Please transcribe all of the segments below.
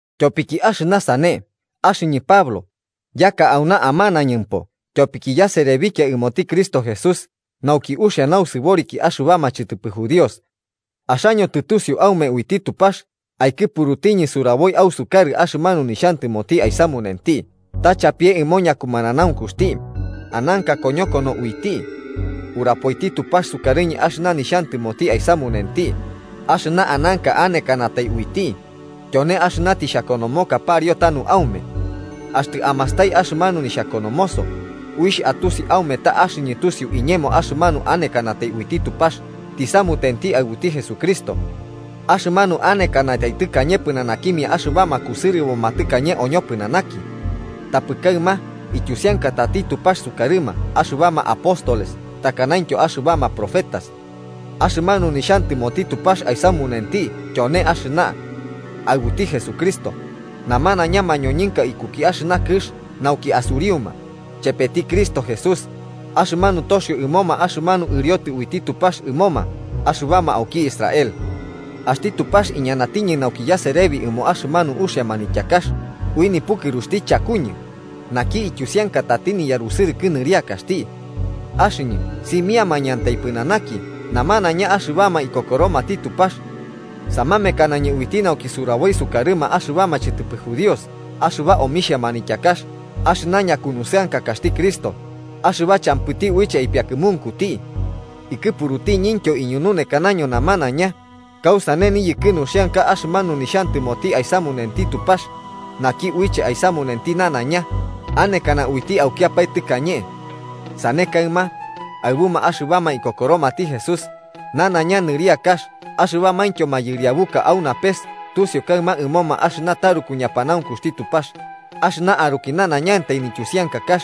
Tyopiki axɨna sane, axɨñɨ Pablo, yaka auna amanañɨmpo tyopiki yaserebikia ɨmoti Cristo Jesús nauki uxia nausɨboriki axɨbama chɨtɨpɨ judíos. Axaño tɨtusiu aume uiti Tupax aikɨpurutiñɨ suraboi ausukarɨ axɨmanu nixhantɨmoti aisamunenti ta chapie ɨmo ñakumananaunkuxti, ananka koñokono uiti. Urapoiti Tupax sukarɨñɨ axɨna nixhantɨmoti aisamunenti axɨna ananka anekanatai uiti, tyone axɨna tixhakonomoka pariu tanu aume. Axtɨ amastai axɨmanu nixhakonomoso, uixh atusi aume ta axɨñɨ tusiu iñemo axɨmanu anekanatai uiti Tupax tisamutenti aɨbuti Jesucristo. Axɨmanu anekanatai tɨkañe pɨnanakimia axɨbama kusɨrɨboma tɨkañe oñopɨnanaki. Tapɨ kaɨma ityusiankatati Tupax sukarɨma axɨbama apóstoles takanaintyo axɨbama profetas. Axɨmanu nixhantɨmoti Tupax aisamunenti tyone axɨna: Aɨbuti Jesucristo, namanaiña mañoñɨnka ikuki kɨx nauki asuriuma, chepeti Cristo Jesús, axɨmanu toxiobo ɨmoma axɨmanu ɨriotɨ uiti Tupax ɨmoma axɨbama auki Israel. Axti Tupax iñanatiñɨ nauki yaserebi ɨmo axɨmanu uxia manityakax ui nipukɨruxti chakuñɨ, naki ityusiankatati niyarusɨrɨkɨ nɨriakaxti. Axɨñɨ simiamañɨantai pɨnanaki namanaiña axɨbama ikokoromati Tupax. Samamekanañɨ uiti nauki suraboi sukarɨma axɨbama chɨtɨpɨ judíos axɨba omixhia manityakax axɨna ñakunusɨankakaxti Cristo, axɨba champɨti uiche aipiakɨmunkuti. Ikɨpurutiñintyo iñununekanaño namanaiña kausane niyɨkɨ nuxiankax axɨmanu nixhantɨmoti aisamunenti Tupax, naki uiche aisamunenti nanaiña, anekana uiti aukiapae tɨkañe. Sane kaɨma, aɨbuma axɨbama ikokoromati Jesús, nanaiña nɨriakax axɨbamaintyo mayɨriabuka au napes tusiu kaɨma ɨmoma axɨna taruku ñapanaunkuxti Tupax, axɨna aruki nanaiñantai nityusiankakax.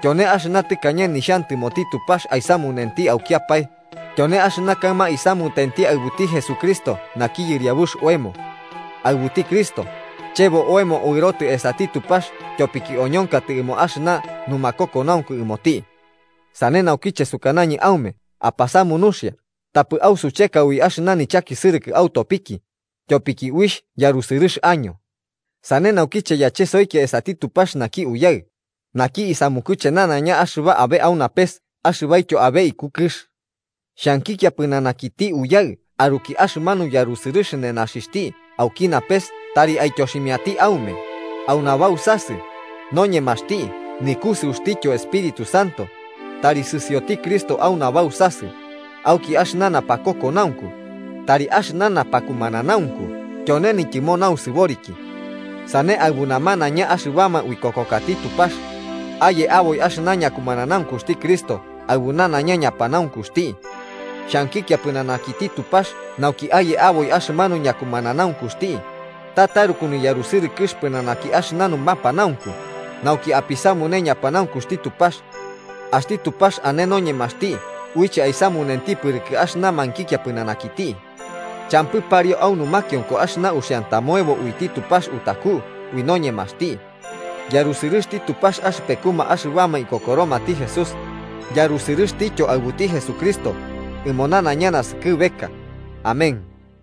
Tyone axɨna tɨkañe nixhantɨmoti Tupax aisamunenti aukiapae, tyone axɨna kaɨma isamutenti aɨbuti Jesucristo naki Yɨriabux oemo. Aɨbuti Cristo, chebo oemo uɨrotɨ esati Tupax tyopiki oñonkatɨ ɨmo axɨna numakokonaunku ɨmoti. Sane naukiche sukanañɨ aume apasamu nuxia tapɨ ausucheka ui axɨna nichakisɨrɨkɨ autopiki, tyopiki uixh yarusɨrɨx año. Sane naukiche yachesoikia esati Tupax naki Uyaɨ, naki isamukuche nanaiña axɨba abe au napes axɨbaityo abe iku kɨx. Xhankikia pɨnanakiti Uyaɨ aruki axɨmanu yarusɨrɨx nenaxixhti auki napes tari aityoximiati aume, au nabausasɨ, noñemaxti nikusɨuxtityo Espíritu Santo, tari sɨsioti Cristo au nabausasɨ auki axɨna napakokonaunku, tari axɨna napakumananaunku tyone nityɨmo nausɨboriki. Sane aɨbu namanaiña axɨbama uikokokati Tupax, aye aboi axɨna ñakumananaunkuxti Cristo aɨbu nanaiña ñapanaunkuxti. Xhankikia pɨnanakiti Tupax nauki aye aboi axɨmanu ñakumananaunkuxti, ta taruku niyarusɨrɨkɨx pɨnanaki axɨna numapanaunku, nauki apisuputane ñapanaunkuxti Tupax. Axti Tupax ane noñemaxti uiche aisamunenti pɨrɨkɨ axɨna mankikia pɨnanakiti. ¡Champɨ pariu au numakionko axɨna uxiantamoebo uiti Tupax utaku ui noñemaxti! ¡Yarusɨrɨxti Tupax axɨpekuma axɨbama ikokoromati Jesús, yarusɨrɨxtityo aɨbuti Jesucristo, ɨmo nanaiña naskɨbeka! Amén.